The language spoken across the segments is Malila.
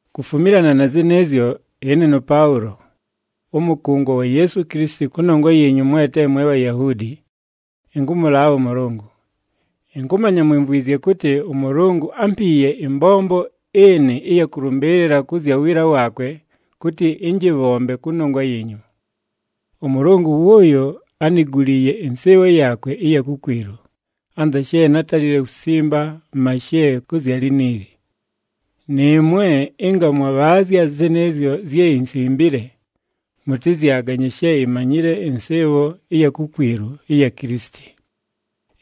Kufumilana na zɨnɨɨzyo ɨne nʉPaʉlo, ʉmʉkʉngwa wa Yeesu Kilisiti kʉnongwa yiinyu mwe te mwe Bhayahuudi, ɨnkʉmʉlaabha ʉMʉlʉngʉ. Ɨnkʉmanya mwimvwizye kʉtɨ ʉMʉlʉngʉ ámpiiye ɨmbombo ɨnɨ ɨya kʉlʉmbɨɨlɨla kʉ zya wiila waakwe kʉtɨ ɨnjɨbhombe kʉnongwa yiinyu. ɄMʉlʉngʉ wʉʉyo ániguliiye ɨnsɨɨbho yaakwe ɨya kukwilu, anza she nátalile kusimba mashe kʉ zya liniili. Nɨɨmwe ɨnga mwabhaazya zɨnɨɨzyo zye insimbile, mʉtɨzyaganye she imanyile ɨnsɨɨbho ɨya kukwilu ɨya Kilisiti.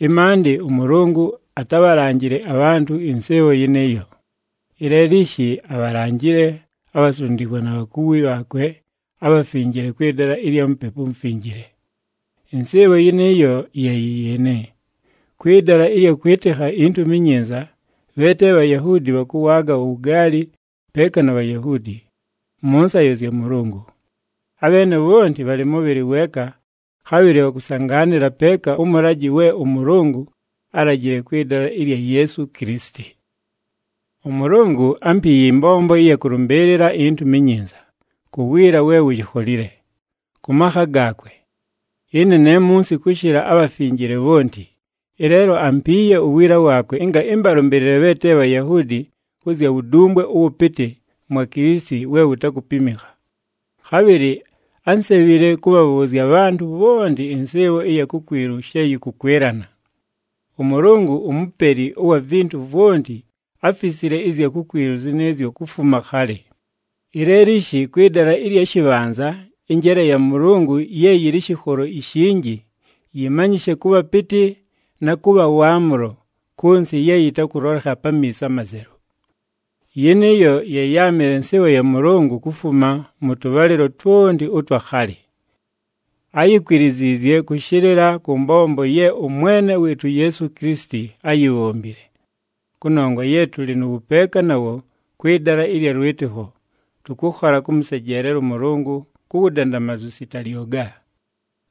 Ɨmaandɨ ʉMʉlʉngʉ atábhalanjile abhantʉ ɨnsɨɨbho yɨnɨɨyo, ɨleelo ishi abhalanjile abhasundikwa na bhakuwi bhaakwe abhafinjile kwɨ dala ɨlya Mupepu uMufinjile. Ɨnsɨɨbho yɨnɨɨyo ye yɨ yɨɨnɨ: kwɨ dala ɨlya kwɨtɨkha iNtumi iNyinza, bhe te Bhayahuudi bhakʉwaaga uwugaali peeka na Bhayahuudi, mʉ nsayo zya Mʉlʉngʉ. Abheene bhonti bhalɨ mʉbhɨlɨ weeka, khabhɨlɨ bhakʉsangaanɨla peeka ʉmʉlajɨ we ʉMʉlʉngʉ álajile kwɨ dala ɨlya Yeesu Kilisiti. ɄMʉlʉngʉ ámpiiye ɨmbombo ɨya kʉlʉmbɨɨlɨla iNtumi iNyinza, ku wiila we wuyikholile, kʉ makha gaakwe. Ɨne ne munsi kʉshɨla abhafinjile bhonti, ɨleelo ampiiye uwiila waakwe ɨnga ɨmbalʉmbɨɨlɨle bhe te Bhayahuudi kʉ zya wudumbwe ʉwʉpɨtɨ mwa Kilisiti we wutakupimikha. Khabhɨlɨ ánsebhile kʉbhabhʉʉzya abhantʉ bhonti ɨnsɨɨbho ɨya kukwilu she yɨkʉkwɨlana. ɄMʉlʉngʉ uMupeli ʉwa vintu vwonti áfisile ɨzya kukwilu zɨnɨɨzyo kufuma khalɨ. Ɨleelo ishi kwɨ dala ɨlya shɨbhanza ɨnjeele ya Mʉlʉngʉ ye yɨlɨ ɨshɨkholo ishinji yɨmanyɨshe kʉ bhapɨtɨ na kʉ bha waamʉlo kʉ nsɨ ye yɨtakʉlolekha pamiiso amazelu. Yɨnɨɨyo ye yáamɨle nsɨɨbho ya Mʉlʉngʉ kufuma mʉ tʉbhalɨlo twonti ʉtwa khalɨ. Áyikwiliziizye kʉshɨlɨla kʉ mbombo ye ʉMwene wɨɨtʉ Yeesu Kilisiti áyibhombile. Kʉnongwa ye tʉlɨ nʉ wʉpeeka nawo kwɨ dala ɨlya lwɨtɨkho, tʉkʉkhola kʉmʉsejeelela ʉMʉlʉngʉ ku wudandamazu sita lyoga.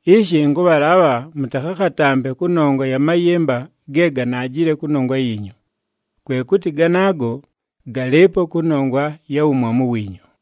Ishi ɨnkʉbhalaabha mʉtakhakhatampe kʉnongwa ya mayɨmba ge ganaajile kʉnongwa yiinyu. Kwe kʉtɨ ganaago galɨɨpo kʉnongwa ya wumwamu wiinyu.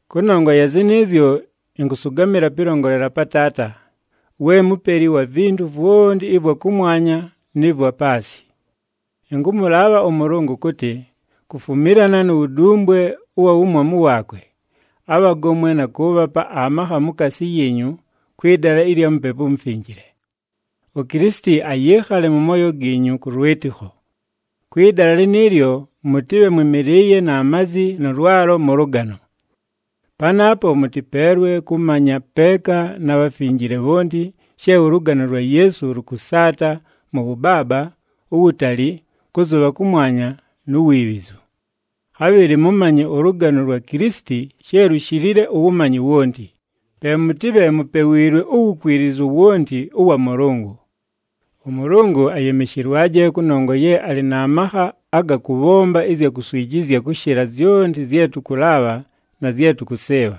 Kʉnongwa ya zɨnɨɨzyo, ɨnkʉsʉgamɨla pɨlongolela pa Taata, we Mupeli wa vintu vwonti ɨvwa kʉmwanya nɨ vwa paasɨ. Ɨnkʉmʉlaabha ʉMʉlʉngʉ kʉtɨ, kufumilana nu wudumbwe ʉwa wumwamu waakwe, abhagomwe na kʉʉbhapa amakha mukaasi yiinyu kwɨ dala ɨlya Mupepu uMufinjile. UKilisiti ayɨɨkhale mʉ mooyo giinyu kʉ lwɨtɨkho. Kwɨ dala lɨnɨɨlyo, mʉtɨbhe mwɨmɨlɨɨye na mazi nʉ lwalo mʉ lʉgano. Panaapo mʉtɨpeelwe kʉmanya, peeka na bhafinjile bhonti she ʉlʉgano lwa Yeesu lʉkʉsaata mʉ wʉbaaba, uwutali, kʉzʉbha kʉmwanya nu wiibhizu. Khabhɨlɨ mʉmanye ʉlʉgano lwa Kilisiti she lushilile uwumanyi wonti, pe mʉtɨbhe mupewiilwe uwukwilizu wonti ʉwa Mʉlʉngʉ. ɄMʉlʉngʉ ayɨmɨshɨlwaje kʉnongwa ye alɨ na makha aga kʉbhomba ɨzya kuswijizya kʉshɨla zyonti zye tʉkʉlaabha na zye tʉkʉsɨɨbha.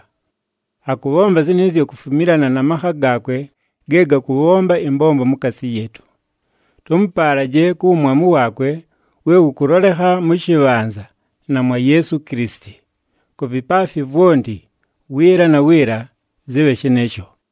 Akʉbhomba zɨnɨɨzyo kufumilana na makha gaakwe ge gakʉbhomba ɨmbombo mukaasi yɨɨtʉ. Tʉmʉpaalaje ku wumwamu waakwe we wʉkʉlolekha mʉ shɨbhanza na mwa Yeesu Kilisiti. Ku vipaafi vwonti, wiila na wiila! Zɨbhe shɨnɨɨsho.